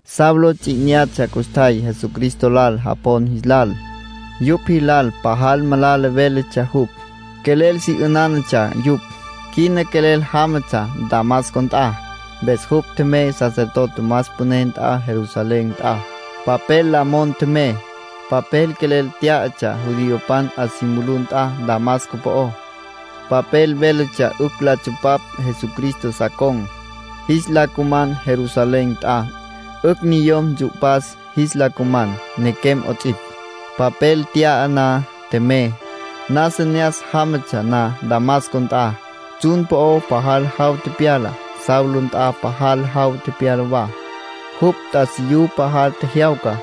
Saulo ts'i 'inyatsja custjay Jesucristo lal japon jis lal. Yupj jilal pajal malala véletsja jupj. Quelel si 'ünánatsja yupj. Quina quelel jámatsja Damasco nt'a. Mpes jupj tjemey sacerdote más püné nt'a Jerusalén nt'a, papel la mon tjemey. Papel quelel t'yatsja judiopan 'a si mulú nt'a Damasco po'ó. Papel véletsja 'ücj la tsupapj Jesucristo sa con̈, jis la cuman Jerusalén nt'a. 'Ücj niyom ntsu'pas jis la cuman, nequem 'ots'ipj. Papel nt'ya na, tjemey. Nasa ne'as jámatsja na Damasco nt'a, tsjun po'o pajal jaw tepyala. Saulo nt'a pajal jaw tepyala wa, jupj t'asiyú pajal tjejyawca.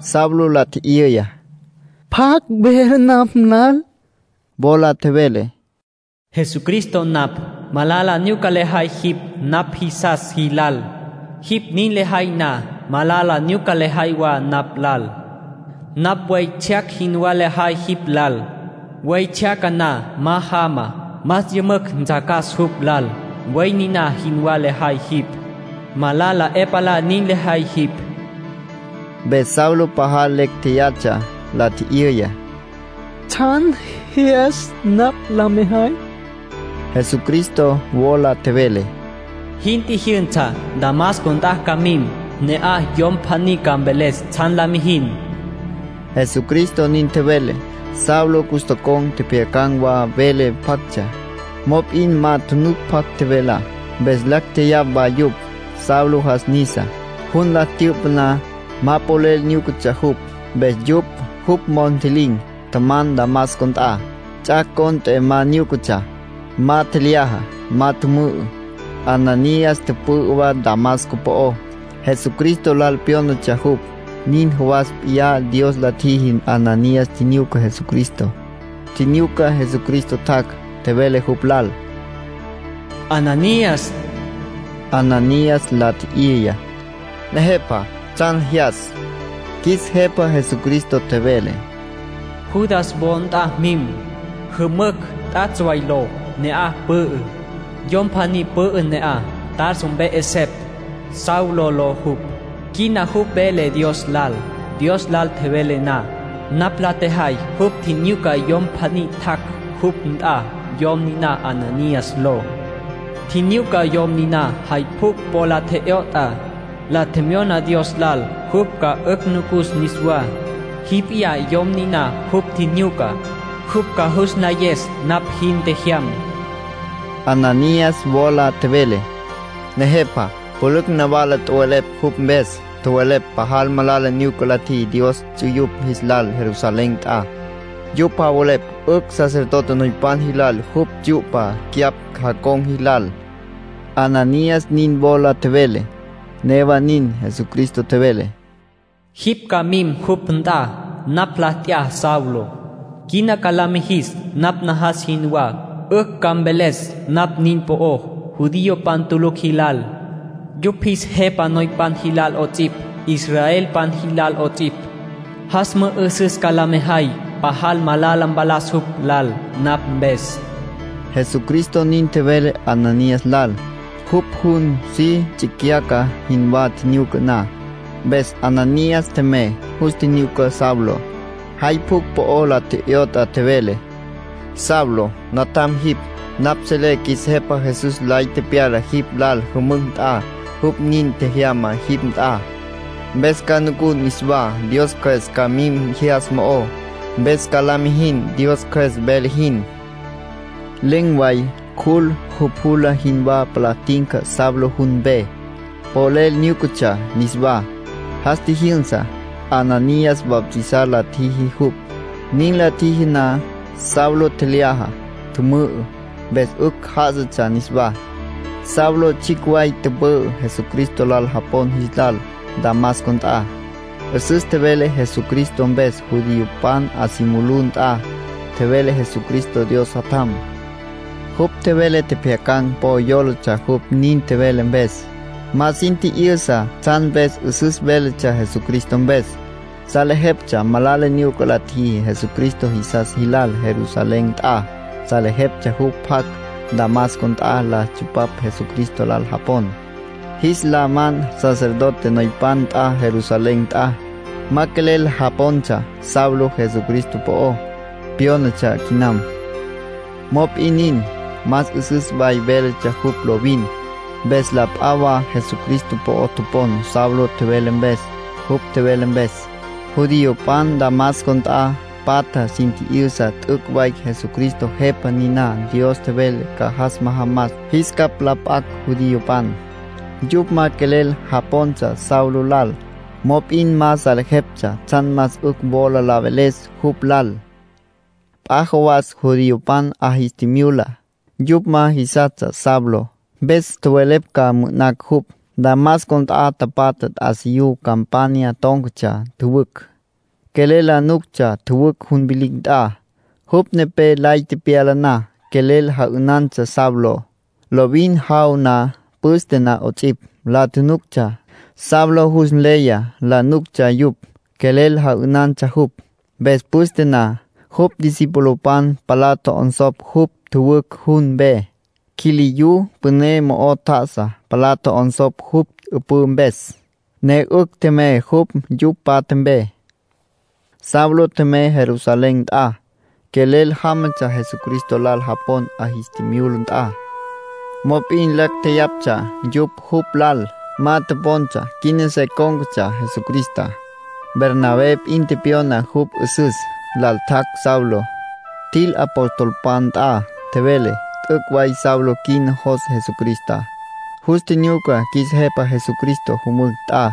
Saulo la tji'yüya: —¿Pjacj vele napj lal? Wola tjevele: —Jesucristo napj. Malala nyuca lejay jipj napj jisas jilal. Jipj nin lejay na, malala nyuca lejay wa napj lal. Napj buey tsjyac jinwá lejay jipj lal. Buey tsjyaca na ma jama, más yümücj ntsjacas jupj lal. Buey niná jinwá lejay jipj. Malala 'e palá nin lejay jipj. Mpes Saulo pajal lecj tjeyatsja, la tji'yüya: —¿Tsjan jyas napj la mejay? Jesucristo wola tjevele: —Jin tjijyünsa. Damasco nt'a ca mim. Ne'aj yom pjaní ca mveles tsjan la mijin —Jesucristo nin tjevele. Saulo cus tocon̈ tjepjyacan̈ wa vele pjactsja. Mop'in ma tjunuc pjacj tjevelá. Mpes lacj tjeyapj wa yupj. Saulo jas nisa. Jun la tyü'pa na, ma polel nyúcatsja jupj. Mpes yupj jupj mos ntji'lin̈ tjaman Damasco nt'a. Ts'ac' cont'e ma nyúcatsja. Ma tjelyaja. Ma tjümü'ü. Ananías tüpü'ü wa Damasco po'ó. Jesucristo lal pyónatsja jupj. Nin jawas p'iyá Dios la tjiji Ananías tjinyuca Jesucristo. Tjinyuca Jesucristo tjac', tjevele jupj lal: —Ananías. Ananías la tji'yüya: —Nejepa, ¿tsjan jyas? Qjuis Jepa Jesucristo tjevele: —Judas wo nt'a mim. Jümücj ‘T'atsj Way’ ló, ne'aj pü'ü. Yom pjaní pü'ü ne'aj, Tarso mpe 'esepj, Saulo ló jupj. Quina jupj vele Dios lal. Dios lal tjevele na, napj la tjejay jupj tjinyuca yom pjaní tjac' jupj nt'a, yom niná Ananías ló. Tjinyuca yom niná jay pjucj po la tje'yot'a, la tjemyona Dios lal jupj ca 'ücj nucus niswá. Jipj p'iyá yom niná jupj tjinyucá. Jupj ca jus nlayes napj jin tjejyam —Jesucristo nin tjevele. Ananías wola tjevele: —Nejepa, pülücj nawala tjowelepj jupj mpes. Tjowelepj pajal malala nyuca la tjiji Dios ts'uyupj jis lal Jerusalén nt'a. Yupj javelepj 'ücj sacerdote noypan jilal jupj tsyu'pa cyapj jacon̈ jilal —Ananías nin wola tjevele. Newa nin, Jesucristo tjevele: —Jipj ca mim jupj nt'a. Napj la t'ya Saulo. Quina ca la mijis napj najas jinwá. 'Ücj ca mveles napj nin po'ó judiopan tulucj jilal, yupj jis jepa noypan jilal 'ots'ipj, israelpan jilal 'ots'ipj. Jas mü'üsüs ca la mejay pajal malala mpalas jupj lal napj mpes —Jesucristo nin tjevele Ananías lal, jupj jun si tsicyaca jinwá tjinyuca na. Mpes Ananías tjemey. Jus tjinyuca Saulo. Jay pjucj po la tje'yot'a, tjevele: “Saulo, natjam jipj. Napj selé qjuis Jepa Jesús lay tepyala jipj lal jümücj nt'a. Jupj nin tjejyama jipj nt'a, mpes ca nucun niswá. Dios Cjües ca mim jyas mo'ó, mpes ca la mijin Dios Cjües vele jin”, Ananías nin tjevele. Len̈ way cjul jupjula jinwá palá tinca Saulo jun mpe, polel nyúcatsja niswá. Jas tjijyünsa. Ananías bautizar la tjiji jupj. Nin la tjiji na, Saulo tjelyaja, tjümü'ü, mpes 'ücj já'asatsja niswá. Saulo tsjicj way tüpü'ü Jesucristo lal japon jilal Damasco nt'a. 'Üsüs tjevele Jesucristo mpes judiopan 'a si mulú nt'a. Tjevele Jesucristo Dios Jatjam. Jupj tjevele tjepjyacan̈ po yólatsja jupj nin tjevele mpes. Ma sin tji'yüsa tsjan mpes 'üsüs véletsja Jesucristo mpes. Salejeptsja malala nyuca la tjiji Jesucristo jisas jilal Jerusalén nt'a. Salejeptsja jupj tjac' Damasco nt'a la tsupapj Jesucristo lal japon, jis la man sacerdote noypan nt'a Jerusalén nt'a. Ma quelel japontsja Saulo Jesucristo po'o pyónatsja quinam. Mop'in nin, más 'üsüs way véletsja jupj lovin, mpes la p'a wa Jesucristo po'o topon Saulo tjevele mpes. Jupj tjevele mpes, judiopan Damasco nt'a patjá sin tji'yüsa t'üc' way Jesucristo Jepa niná Dios tjevele ca jas majamas jis capj la p'acj judiopan. Yupj ma quelel japontsja Saulo lal, mop'in ma salejeptsja tsjan más 'ücj wola la veles jupj lal. P'a jawas judiopan 'a jis tjimyula. Yupj ma jisastsja Saulo. Mpes tjowelepj ca mü'ü'nacj jupj. Damasco nt'a tapatja t'asiyú campanya tón̈catsja tjüwücj. Quelel la nuctsja tjüwücj jun vilicj nt'a; jupj nepé lay tepyala na, quelel ja'ünantsja Saulo. Lovin jaw na, püste na 'ots'ipj, la tjunuctsja. Saulo jus nleya la nuctsja yupj, quelel ja'ünantsja jupj. Mpes püste na, jupj discipulopan palá tjo'onsopj jupj tjüwücj jun mpe. Quiliyú püné mo'o tjá'asa, palá tjo'onsopj jupj 'üpǘ mpes, ne 'ücj tjemey jupj yupj tapatja mpe. Saulo tjemey Jerusalén nt'a. Quelel jámatsja Jesucristo lal japon 'a jis tjimyula nt'a. Mop'in lacj tjeyaptsja yupj jupj lal. Ma topontsja quina se cón̈catsja Jesucristá. Bernabé p'in tepyona jupj 'üsüs. Lal tjac' Saulo, tjil apostolpan nt'a. Tjevele: “T'üc' way Saulo quina jos Jesucristá. Jus tjinyuca qjuis Jepa Jesucristo jümücj nt'a,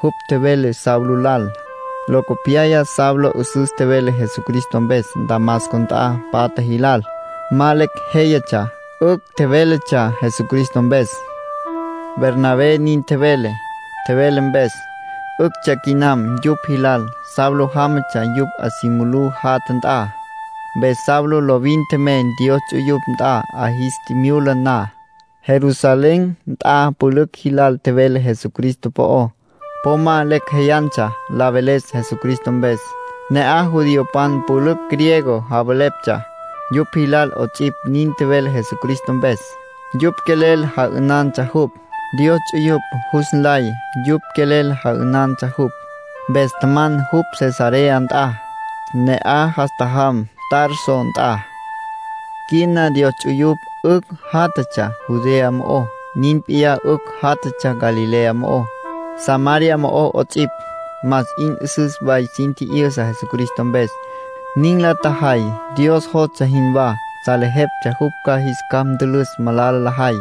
jupj tjevele Saulo lal. Locopyaya Saulo 'üsüs tjevele Jesucristo mpes Damasco nt'a patja jilal. Ma lecj jéyatsja; 'ücj tjevéletsja Jesucristo mpes”, Bernabé nin tjevele. Tjevele mpes, 'üctsja quinam yupj jilal Saulo jámatsja yupj 'a si mulú jatja nt'a. Mpes Saulo lovin tjemey Dios ts'uyupj nt'a 'a jis tjimyula na. Jerusalén nt'a pülücj jilal tjevele Jesucristo po'ó. Po ma lecj jéyatsja la veles Jesucristo mpes. Ne'aj judiopan pülücj griego javeleptsja. Yupj jilal 'ots'ipj nin tjevele Jesucristo mpes. Yupj quelel ja'ünantsja jupj. Dios ts'uyupj jus nlay yupj quelel ja'ünantsja jupj. Mpes tjaman jupj Cesarea nt'a. Ne'aj jas tjajam Tarso nt'a. Quina Dios ts'uyupj 'ücj játjatsja Judea mo'ó, nin p'iyá 'ücj játjatsja Galilea mo'ó, Samaria mo'ó 'ots'ipj. Más 'in 'üsüs way sin tji'yüsa Jesucristo mpes. Nin la tjajay Dios jostsja jinwá; salejeptsja jupj ca jis capj ntülüs malala lajay.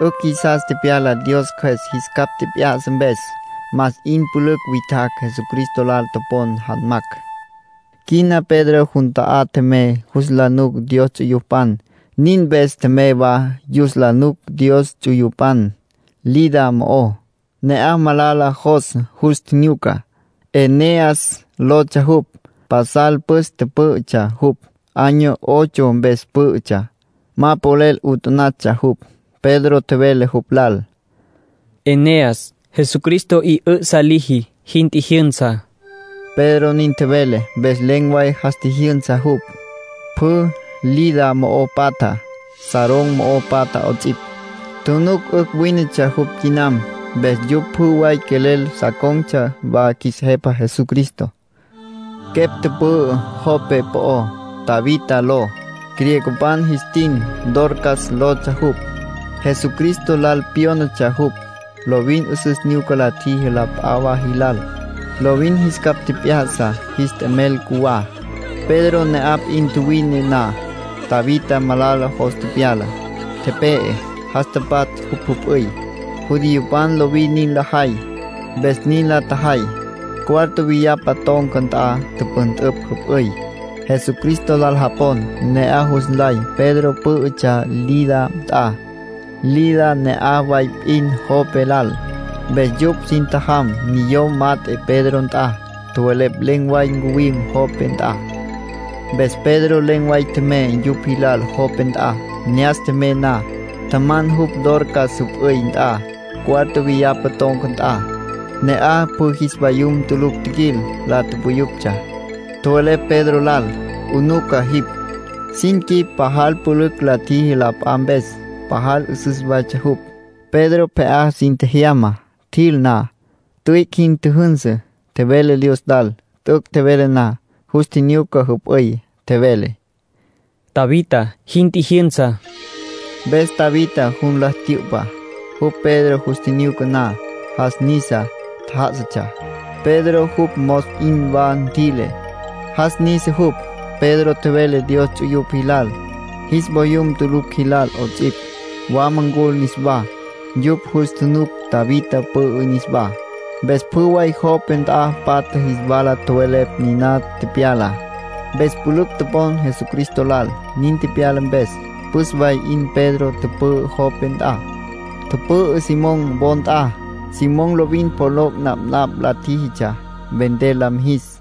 'Ücj jisas tepyala Dios Cjües jis capj tjep'ya'sa mpes. Más 'in pülücj witjacj Jesucristo lal topon janmacj. Quina Pedro jun ta'á tjemey yus la nuc Dios ts'uyupan. Nin mpes tjemey wa yus la nuc Dios ts'uyupan Lida mo'ó. Ne'aj malala jos jus tjinyuca. Eneas lotsja jupj. Pasal püs pǘ'ütsja jupj, año ocho mpes pǘ'ütsja. Ma polel 'utanatsja jupj. Pedro tjevele jupj lal: “Eneas, Jesucristo 'i 'ü'sa liji. Jin tjijyünsa”, Pedro nin tjevele. Mpes len̈ way jas tjijyünsa jupj. Pjü Lida mo'o patja, Sarón mo'o patja 'ots'ipj, tjunuc 'ücj wínetsja jupj quinam. Mpes yupj pjü way quelel sa con̈tsja wa qjuis Jepa Jesucristo. Quepj tüpü'ü Jope po'ó, Tabita ló. Griegopan jis tin Dorcas lotsja jupj. Jesucristo lal pyónatsja jupj. Lovin 'üsüs nyuca la tjiji la p'a wa jilal. Lovin jis capj tjep'ya'sa jis t'emel cjuwá. Pedro ne'aj p'in tjuwine na, Tabita malala jos tepyala, tepe'e. Jas tapatsj jupj jüp'üy. (Judiopan lovin nin lajay, mpes nin la tjajay.) Cuarto viyapa ton̈ca nt'a tüpüntüpj jüp'üy. Jesucristo lal japon ne'aj jus nlay Pedro pǘ'ütsja Lida nt'a. Lida ne'aj way p'in Jope lal. Mpes yupj sin tjajam niyom mat'e Pedro nt'a. Tjowelepj len̈ way ncuwim Jope nt'a. Mpes Pedro len̈ way tjemey yupj jilal Jope nt'a. Ne'as tjemey na, tjaman jupj Dorcas jüp'üy nt'a, cuarto viyapa ton̈ca nt'a. Ne'aj pjü jis vayum tulucj tjiquil, la puyuptsja. Tjowelepj Pedro lal: “'Unuca jipj, sin quip pajal pülücj la tjiji la p'a mpes. Pajal 'üsüs waytsja jupj.” Pedro pje'á sin tjejyama. Tjil na, tüic' jin tjüjünsü, tjevele Dios lal. T'üc' tjevele na, jus tjinyuca jüp'üy, tjevele: “Tabita, jin tjijyünsa”. Mpes Tabita jun la tyü'pa. Jupj Pedro jus tjinyuca na, jas nisa, tjá'asatsja. Pedro jupj mos 'in wa ntjüi'le, jas nisa jupj. Pedro tjevele Dios ts'uyupj jilal, jis voyum tulucj jilal 'ots'ipj, wama ncul niswá. Yupj jus tjunuc Tabita pü'ü niswá. Mpes pjü way Jope nt'a patja jis wala tjowelepj niná tepyalá. Mpes pülücj topon Jesucristo lal, nin tepyala mpes. Püs way 'in Pedro tüpü'ü Jope nt'a. Tüpü'ü Simón wo nt'a. Simón lovin pjoloc' napnapj la tjíjitsja, vender la mijis.